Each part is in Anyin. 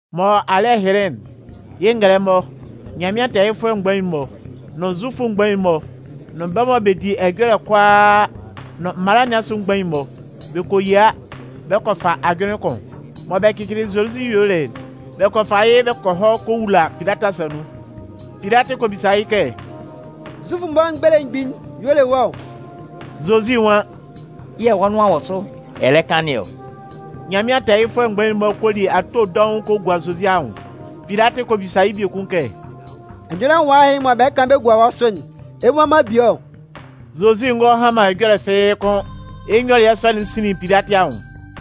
Mɔ alɩ́ɛ hɩnlɩn'n, yɩ́ ngɛlɛmɔ, Nyanmɩan tɛɛyɩfʋɛ mgbain'n-mɔ, nʋn Zufʋ mgbain'n-mɔ nʋn bɛ́ mɔ bɛ di ɛjɔlɛ'n kʋalaa nʋn mala nɩn asʋ mgbain'n-mɔ, bɛ kɔ yia bɛ kɔ fa ajʋnlɩn kʋn. Mɔ bɛ cɩcɩlɩ Zozi yuelɩ'n, bɛ kɔ fa yɩ́ bɛ kɔ hɔ kɔ wula Pilatɩ asa nun. Pilatɩ kɔ bisa yɩ́ kɛ: “Zufʋ'n-mɔ belemgbin'n y'ɔ le wɔ́ ɔ?” Zozi nwan: “Yɛ̂ wɔ́ nʋan wɔ sʋ ɛ lɛ kan nɩn ɔ.” Nyanmɩan tɛɛyɩfʋɛ mgbain'n-mɔ kɔ li ato dɔʋn kɔ gua Zozi anwʋn. Pilatɩ kɔ bisa yɩ́ biekun kɛ: “Ɛjɔlɛ nwala ɛhɩ mɔ bɛ lɛ kan bɛ gua wɔ́ sʋ'n, ɛ mmua man bie ɔ?” Zozi ngɔ han man ɛjɔlɛ fɩ́ɩ́ kʋ́n. Yɩ́ nyɔlɩɛ sɔ'n sinlin Pilatɩ anwʋn.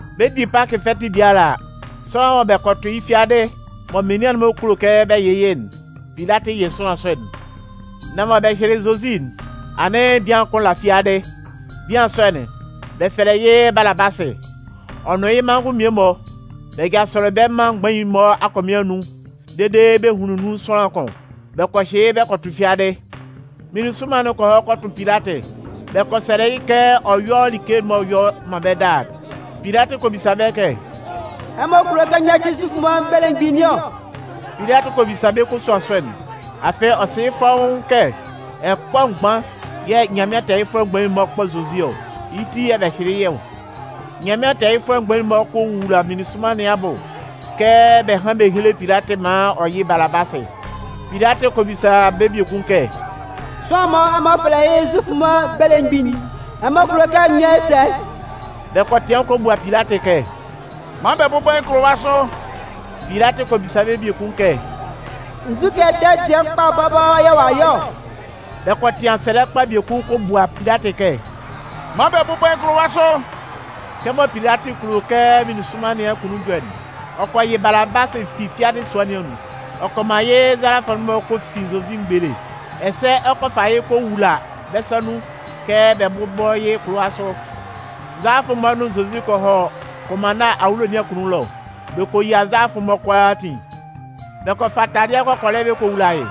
Bɛ 'di Pakɩ fɛtɩ biala a, sʋanlan mɔ bɛ kɔ tʋ yɩ́ fiadɩ mɔ menian'n-mɔ kulo kɛ bɛ yɩ yɩ́'n, Pilatɩ yɩ sʋanlan sɔ'n. Nan mɔ bɛ hyɩlɩ Zozi'n, anɩn bian kʋn la fiadɩ. Bian sɔ'n, bɛ fɛlɛ yɩ́ Balabasɩ. Ɔ nʋn yɩ́ manngʋn mmie-mɔ bɛ jasʋlɩ bɛ mân mgbain'n-mɔ akɔmɩn anun dede bɛ hunlin nun sʋanlan kʋn. Bɛ kɔ hyɩ yɩ́ bɛ kɔ tʋ fiadɩ. Meninsʋnman'n kɔ hɔ kɔ tʋ Pilatɩ. Bɛ kɔ sɛlɛ yɩ́ kɛ ɔ yɔ́ like'n m'ɔ yɔ man bɛ́ daa'n. Pilatɩ kɔ bisa bɛ́ kɛ: “Ɛmɔ kulo kɛ n yáci Zufʋ'n-mɔ belemgbin nɩn ɔ?” Pilatɩ kɔ bisa bɛ́ kosuan sɔ'n, afɩ ɔ sɩ fɔ́ʋ́n kɛ ɛkpɔ mgban yɛ̂ Nyanmɩan tɛɛyɩfʋɛ mgbain'n-mɔ kpɔ Zozi ɔ. Yɩ́ ti yɛ̂ bɛ hyɩlɩ yɩ́ ɔ. Nyanmɩan tɛɛyɩfʋɛ mgbain'n-mɔ kɔ wowula meninsʋnman nɩn abʋ kɛ bɛ hán bɛ héle Pilatɩ maan ɔ yɩ́ Balabasɩ. Pilatɩ kɔ bisa bɛ́ biekun kɛ: “Sʋanlan'n mɔ ɛmɔ fɛlɛ yɩ́ Zufʋ'n-mɔ belemgbin'n, ɛmɔ kulo kɛ n yɔ́ yɩ́ sɛ?” Bɛ kɔ tɩan kɔ bua Pilatɩ kɛ: “Man bɛ bʋ́bɔ yɩ́ kʋlʋwa sʋ.” Pilatɩ kɔ bisa bɛ́ biekun kɛ: “Nzukɛ ɛtɛ dɩɛ kpa bɔbɔ yɛ̂ ɔ'a yɔ ɔ?” Bɛ kɔ tɩan sɛlɛ kpa biekun kɔ bua Pilatɩ kɛ: “Man bɛ bʋ́bɔ yɩ́ kʋlʋwa sʋ.” Kɛmɔ Pilatɩ kulo kɛ meninsʋnman nɩn akunnun jɔ'n, ɔ kɔ yɩ Balabasɩ fi fiadɩ sua nɩn anun. Ɔ kɔ man yɩ́ nzalafʋ'n-mɔ kɔ fin Zozi mgbele. Ɛsɛ ɔ kɔ fa yɩ́ kɔ wula bɛ́ sa nun kɛ bɛ bʋ́bɔ yɩ́ kʋlʋwa sʋ. Nzalafʋ'n-mɔ nʋn Zozi kɔ hɔ kʋnmanna awulo nɩn akunnun ɛlɔ. Bɛ kɔ yia nzalafʋ'n-mɔ kʋalaatin. Bɛ kɔ fa taladɩɛ kɔkɔlɛ bɛ kɔ wula yɩ́,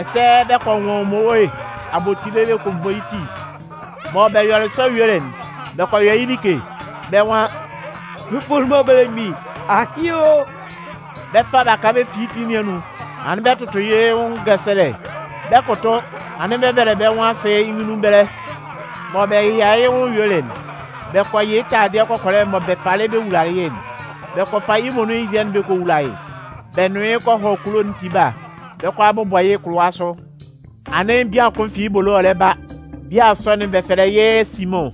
ɛsɛ bɛ kɔ nwʋn mmowe abotile bɛ kɔ bɔ yɩ́ ti. Mɔ bɛ yɔlɩ sɔ yuelɩ'n, bɛ kɔ yɔ yɩ́ like. Bɛ́ nwan: “Zufʋ'n-mɔ belemgbin, ahɩn o!” Bɛ 'fa baka bɛ fin yɩ́ ti nɩn anun, anɩn bɛ 'tʋtʋ yɩ́ nwʋn ngɛsɛlɛ. Bɛ 'kʋtʋ anɩn bɛ 'bɛbɛlɛ bɛ́ nwʋn asɩ yɩ́ nyunnun ɛbɛlɛ. Mɔ bɛ yɛyalalɩ yɩ́ nwʋn yuelɩ'n, bɛ kɔ yɩ taladɩɛ kɔkɔlɛ'n mɔ bɛ falɩ bɛ wulalɩ yɩ́'n. Bɛ kɔ fa yɩ́ muonun yɩ́ dɩɛ'n bɛ kɔ wula yɩ́. Bɛ nʋn yɩ́ kɔ hɔ kulo'n tiba, bɛ 'kɔ a bʋbɔ yɩ́ kʋlʋwa sʋ. Anɩn bian kʋn fi yɩ́ ebolo ɔ lɛ ba. Bian sɔ'n bɛ fɛlɛ yɩ́ Simʋn.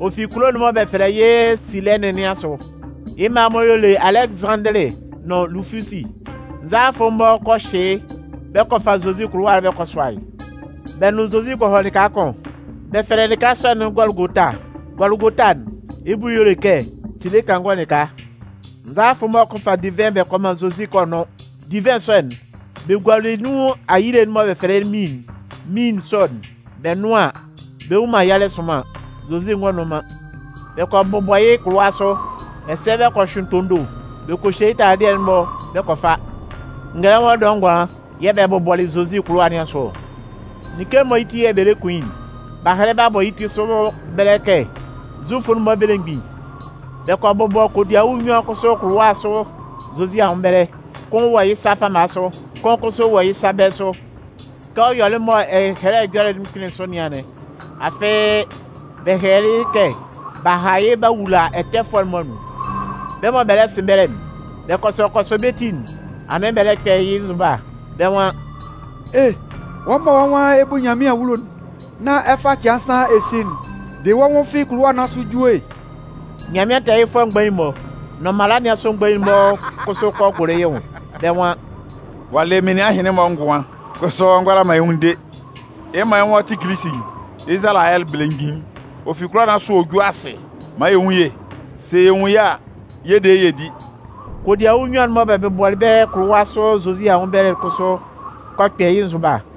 Ɔ fi kulo'n mɔ bɛ fɛlɛ yɩ́ Silɛnɩn nɩn asʋ. Yɩ́ mma-mɔ y'ɔ le Alɛgɩzanndɩlɩ nʋn Lufusi. Nzalafʋ'n-mɔ kɔ hyɩ yɩ́ bɛ kɔ fa Zozi kʋlʋwa'n bɛ kɔ sʋa yɩ́. Bɛ nʋn Zozi kɔ hɔ lɩka kʋn. Bɛ fɛlɛ lɩka sɔ'n Gɔlʋgota. Gɔlʋgota'n, yɩ́ bʋ y'ɔ le kɛ “tile kangɔ lɩka”. Nzalafʋ'n-mɔ kɔ fa divɩn bɛ kɔ man Zozi kɛ ɔ nʋ́n. Divɩn sɔ'n, bɛ gualɩ nun ayile'n mɔ bɛ fɛlɛ yɩ́ míin'n. (Míin sɔ'n, bɛ nʋn an, bɛ nnwun man yalɛ'n sʋnman.) Zozi ngɔ nʋn man. Bɛ kɔ bʋbɔ yɩ́ kʋlʋwa sʋ. Ɛsɛ bɛ kɔ hyʋɩn tondo bɛ kɔ hye yɩ́ taladɩɛ'n-mɔ bɛ kɔ fa. Ngɛlɛmɔ dɔɛ ngʋanlan yɛ̂ bɛ bʋbɔlɩ Zozi kʋlʋwa nɩn asʋ ɔ. Like'n mɔ yɩ́ ti yɛ̂ bɛ lɛ kun yɩ́'n, b'a hɛlɛ b'a bɔ yɩ́ ti sʋ ɛbɛlɛ kɛ: “Zufʋ'n-mɔ belemgbin”. Bɛ kɔ bʋbɔ kodiawu nnyuan kʋsʋ kʋlʋwa sʋ Zozi anwʋn ɛbɛlɛ. Kʋn wɔ yɩ́ sa fama sʋ, kʋn kʋsʋ wɔ yɩ́ sa bɛ̂ sʋ. [ Kɛ ɔ yɔlɩ mɔ Ɛhɛlɛ Ɛjɔlɛ'n kpɩnlɩn sʋ nɩn anɩn. Afɩ, bɛ hɛlɛlɩ yɩ́ kɛ: B'a ha yɩ́ b'a wula ɛtɛfʋɛ'n-mɔ anun.] Bɛ́ mɔ bɛ 'sɩn ɛbɛlɛ'n, bɛ kɔsɔ kɔsɔ bɛ́ ti'n, anɩn bɛ lɛ kpɛ yɩ́ nzʋba. Bɛ́ nwan: “E! Wɔ́ mɔ wɔ́ nwan ɛ 'bu Nyanmɩan awulo'n nán ɛ fa cɩan nsan ɛ si'n, de wɔ́ nwʋn fi kʋlʋwa nɩn asʋ ju e!” Nyanmɩan tɛɛyɩfʋɛ mgbain'n-mɔ, nʋn mala nɩn asʋ mgbain'n-mɔ kʋsʋ kɔ gʋlʋ yɩ́ nwʋn. Bɛ́ nwan: “Ɔ'a le menian ɛhɩnlɩn-mɔ ngʋan, kʋsʋ ɔ ngʋala man yɩ́ nwʋn de. Yɩ́ mɔ yɩ́ nwan ɔ tɩ Kilisi'n, Izalayɛ belemgbin'n, ɔ fi kʋlʋwa nɩn asʋ ɔ jú asɩ maan yɛ nwún yɩ́ e! Sɛ yɛ nwun yɩ́ a, yɛ 'de yɩ́ yɛ di.” Kodiawu nnyuan'n mɔ bɛ bʋbɔlɩ bɛ́ kʋlʋwa sʋ Zozi anwʋn ɛbɛlɛ'n kʋsʋ kɔ kpɛ yɩ́ nzʋba.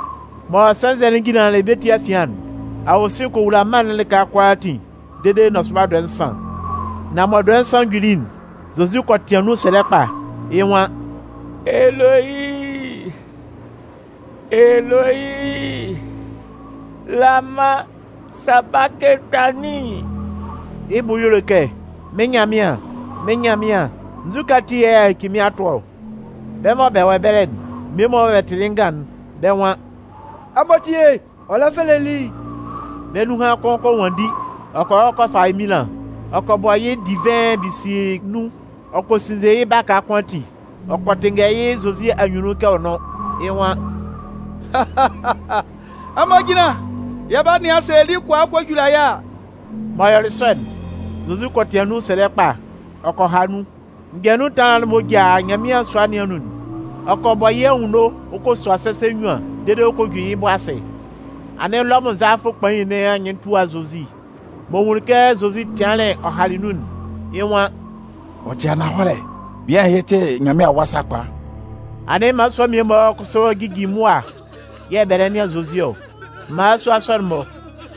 Mɔ sɛnzɛ'n jinlanlɩn bɛ́ ti afian'n, awosin kɔ wula mân'n lɩka kʋalaatin dede nɔsʋba dɔɛ nsan. Nan mɔ dɔɛ nsan juli'n, Zozi kɔ tɩan nun sɛlɛ kpa, yɩ́ nwan: “Eloyi, Eloyi, lama sabakɩtanin?” Yɩ́ bʋ y'ɔ le kɛ: “Mɩ́n Nyanmɩan, mɩ́n Nyanmɩan, nzukɛ ati yɛ̂ a yaci mɩ́n a tʋ ɔ?” Bɛ́ mɔ bɛ wɔ ɛbɛlɛ'n mmie-mɔ mɔ bɛ tɩlɩ yɩ́ ngan'n, bɛ́ nwan: “Ɛmɔ tíe, ɔ lɛ fɛlɛ Eli!” Bɛ́ nunhan kʋn kɔ nwanndi ɔ kɔ hɔ kɔ fa eminlan. Ɔ kɔ bɔ yɩ́ divɩn bisii nun ɔ kɔ sinnze yɩ́ baka kʋn ati. Ɔ kɔ tɩnngɛ yɩ́ Zozi anyunnun kɛ ɔ nʋ́n. Yɩ́ nwan: “Ɛmɔ jínlan! Yɛ 'ba nɩan sɛ Eli kɔ a kɔ jula yɩ́ a!” M'ɔ yɔlɩ sɔ'n, Zozi kɔ tɩan nun sɛlɛ kpa, ɔ kɔ ha nun. Mgbɛ nun ɛtanlan'n m'ɔ ja Nyanmɩan sua nɩn anun'n, ɔ kɔ bɔ yɩ́ anwunno ɔ kɔ sua sɛsɛ nnyuan dede ɔ kɔ ju yɩ́ bʋ asɩ. Anɩn Lɔmʋn nzalafʋ kpain nɩn anyɩn tua Zozi. M'ɔ nwunlin kɛ Zozi tɩanlɩn ɔ halɩ nun'n, yɩ́ nwan: “Ɔ tɩ ananhɔlɛ, bian ɛhɩ tɩ Nyanmɩan Awa sakpa!” Anɩn mmalasua mmie-mɔ kʋsʋ jijin mʋa yɛ̂ bɛ lɛ nɩan Zozi ɔ. Mmalasua sɔ'n-mɔ,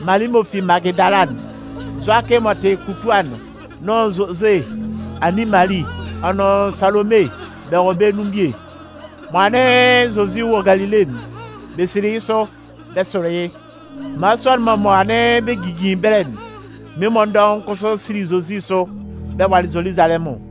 Mali m'ɔ fi Magɩdala'n, Zʋakɩ m'ɔ tɩ Kutua'n nʋn Zozʋ anin Mali, ɔ nʋn Salome, bɛ wɔ bɛ́ nun bie. Mɔ anɩn Zozi wɔ Galile'n, bɛ sili yɩ́ sʋ, bɛ sʋlɩ yɩ́. Mmalasua'n-mɔ mɔ anɩn bɛ jijin ɛbɛlɛ'n, mmie-mɔ dɔʋn kʋsʋ sili Zozi sʋ bɛ walɩ Zoluzalɛmʋn.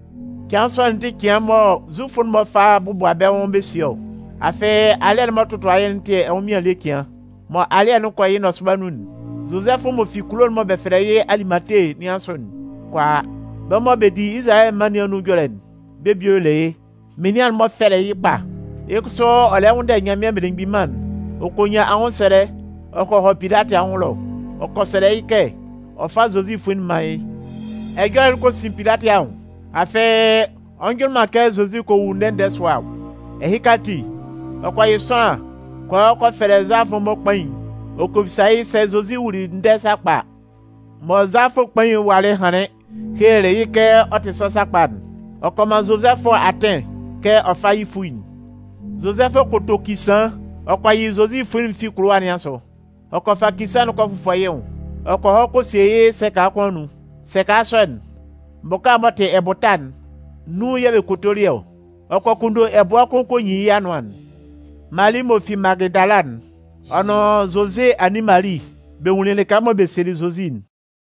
Cɩan sɔ'n tɩ cɩan mɔ Zufʋ'n-mɔ fa bɔbʋa bɛ́ nwʋn bɛ sie ɔ. Afɩ alɩ́ɛ'n m'ɔ tɔtʋa yɩ́'n tɩ ɛnwʋnmɩan ele cɩan. Mɔ alɩ́ɛ'n 'kɔ yɩ́ nɔsʋba nun'n, Zozɛfʋ m'ɔ fi kulo mɔ bɛ fɛlɛ yɩ́ Alimate nɩn asʋ'n kɔ a. Bɛ́ mɔ bɛ di Izalayɛ mân nɩn anun ɛjɔlɛ'n, bɛ́ bie y'ɔ le yɩ́. Menian'n-mɔ fɛlɩ yɩ́ kpa. Yɩ́ kʋsʋ ɔ lɛ nwʋnndɛ Nyanmɩan Belemgbin Mân'n. Ɔ kɔ nyan anwʋnsɛlɛ ɔ kɔ hɔ Pilatɩ anwʋn ɛlɔ. Ɔ kɔ sɛlɛ yɩ́ kɛ ɔ fá Zozi fuin'n mán yɩ́. Ɛjɔlɛ'n kɔ sin Pilatɩ anwʋn. Afɩ ɔ njʋnlɩn man kɛ Zozi kɔ wu ndɛ-ndɛ sʋa ɔ. Ɛhɩka ati, ɔ kɔ yɩ́ sʋanlan kɔ hɔ kɔ fɛlɛ nzalafʋ'n-mɔ kpain'n ɔ kɔ bisa yɩ́ sɛ Zozi wuli ndɛ sakpa a. Mɔ nzalafʋ kpain'n walɩ hanlɩn helelɩ yɩ́ kɛ ɔ tɩ sɔ sakpa'n, ɔ kɔ man Zozɛfʋ atɩn kɛ ɔ fá yɩ́ fuin'n. Zozɛfʋ kɔ to kisaan. Ɔ kɔ yɩ Zozi fuin'n fi kʋlʋwa nɩn asʋ. Ɔ kɔ fa kisaan'n kɔ fʋfɔ yɩ́ nwʋn. Ɔ kɔ hɔ kɔ sie yɩ́ sɛka kʋn anun. Sɛka sɔ'n, bʋka m'ɔ tɩ ɛbʋta'n, nun yɛ̂ bɛ kotolɩ yɩ́ ɔ. Ɔ kɔ kunndo ɛbʋɛ kʋn kɔ nyin yɩ́ anʋan'n. Mali m'ɔ fi Magɩdala'n, ɔ nʋn Zozʋ anin Mali, bɛ nwunlin lɩka mɔ bɛ sielɩ Zozi'n.